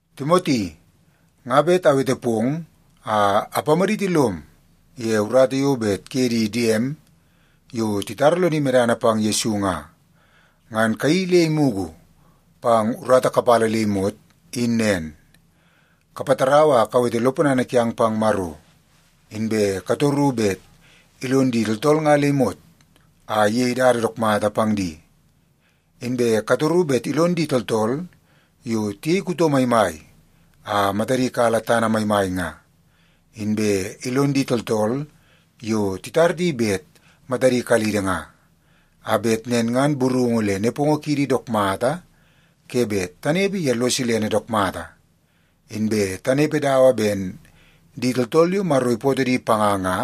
Timoti, nga bet awete pong a apamaditi lom ye urata yo bet kuye di diem, yo titara lodi medana pang Yesu nga, ngan kayeii le imugu pang urata kapala le imot, in nen. Kapatarau a kawete lo ponana kiang pang Maro, inbe katoru bet ilon di tooltool nga le imot a iyei dada dook mata pang di. Inbe katoru bet ilon di tooltool yo tiyei kuto maimai a matadi kala tana maimai nga, inbe ilon di tooltool yo titar di bet matadi kalidi nga, a bet nen ngan burungu le nepongo kiidi dook mata ke bet tanepe ye lo silene dook mata, inbe tanepe dawa ben di tooltool yo Maro ipootoo di panga nga,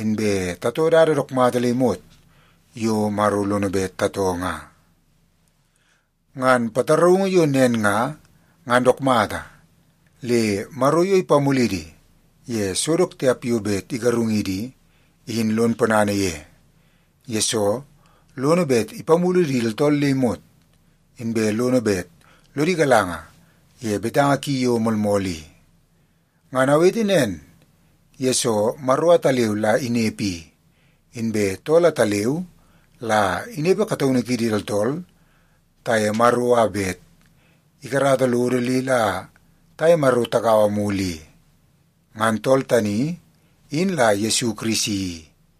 inbe tatoo dada dook mata le imot yo Maro lono bet tatoo nga. Ngan pataraungu yo nen nga, ngan dook mata, le Maro yo ipamulidi ye so dook tiap yo bet igarungidi i, in lon ponana ye. Yesoo, lono bet ipamulu di tooltool le imot, inbe lono bet lodi galanga ye betanga ki yo moolmool i. Ngan awete nen, yesoo Maro ataleu la inepe i, inbe tool ataleu la inepe kataunu kiidi tooltool taye Maro a bet ikarata lodo le la taye Maro tagaua mulu i. Ngan tool tani, in la Yesu Kirisi,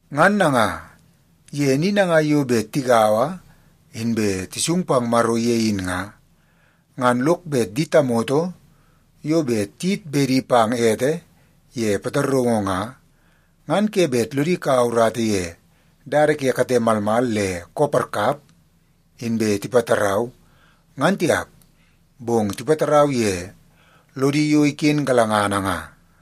Ngan nanga, ye ni nangai yo bet tigaua inbe tisung pang Maro ye in nga, ngan lok bet di tamoto yo bet tiyit bedi pang ete ye pataraungu nga, ngan ke bet lodi kaua urata ye dada ke kate malmal le koo parkap inbe tipatarau, ngan tiap. Bong tipatarau ye lodi yo iken galangana nga.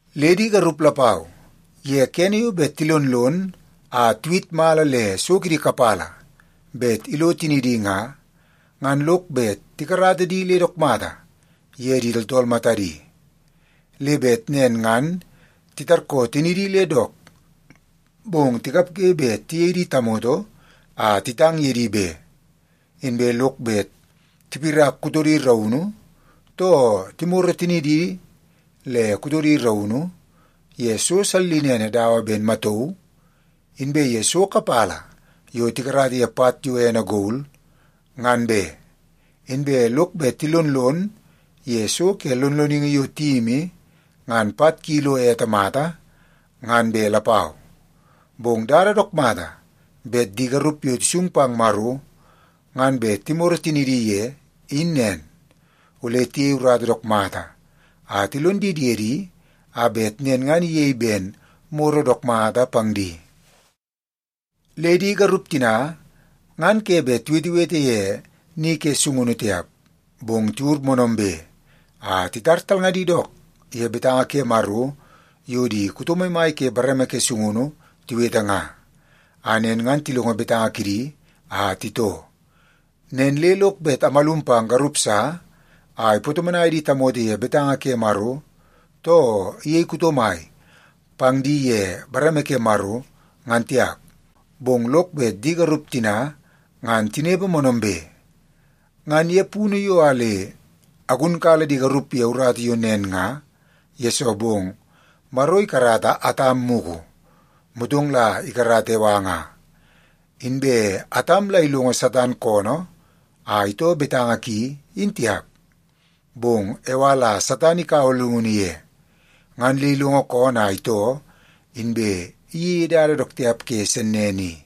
Le di garup lapau, ye kene yo bet tilonlon a tiwit mala le so kidi kapala bet ilo tinidi nga, ngan lok bet tikarata di le dook mata ye di tooltool matadi. Le bet nen ngan titarkoo tinidi le dook, bong tikapge bet tiyei di tamoto a titang ye di be. Inbe lok bet tipirak kutodi raunu, too timoro tinidi le kutodi raunu ye so sallinene dawa ben matauu inbe ye so kapala yo tikarata ye pat yo ene gol, ngan be. Inbe lok bet tilonlon ye so ke lonloningi yo tiyimi ngan pat ki lo ete mata, ngan be lapau. Bong dada dook mata bet di garup yo tisung pang Maro ngan bet timoro tinidi ye, in nen. Ole tiyei urata dook mata a tilon di diedi a bet nen ngan iyei ben moro dook mata pang di. Le di garup tina ngan ke bet tiwetewete ye ni ke sungunu tiap, bong tiwur moonoombe a titar talngadi dook ye betanga ke Maro yo di kuto maimai ke bareme ke sungunu tiwete nga, a nen ngan tilongo betanga kidi a titoo. Nen le lok bet amalum pang garup sa a ipatomonai di tamoto ye betanga ke Maro, too iyei kuto mai pang di ye bareme ke Maro, ngan tiap. Bong lok bet di garup tina ngan tinepe moonoombe. Ngan ye punu yo a le agunkala di garup ye urata yo nen nga, yesoo bong Maro ikarata Atam mugu, motong la ikarata Ewa nga. Inbe Atam la ilongo Satan koonoo a itoo betanga ki, in tiap. Bong Ewa la Satan ikaua llungunu ye, ngan le ilongo koonoo a itoo, inbe iyeie dada dook tiap ke sennene i.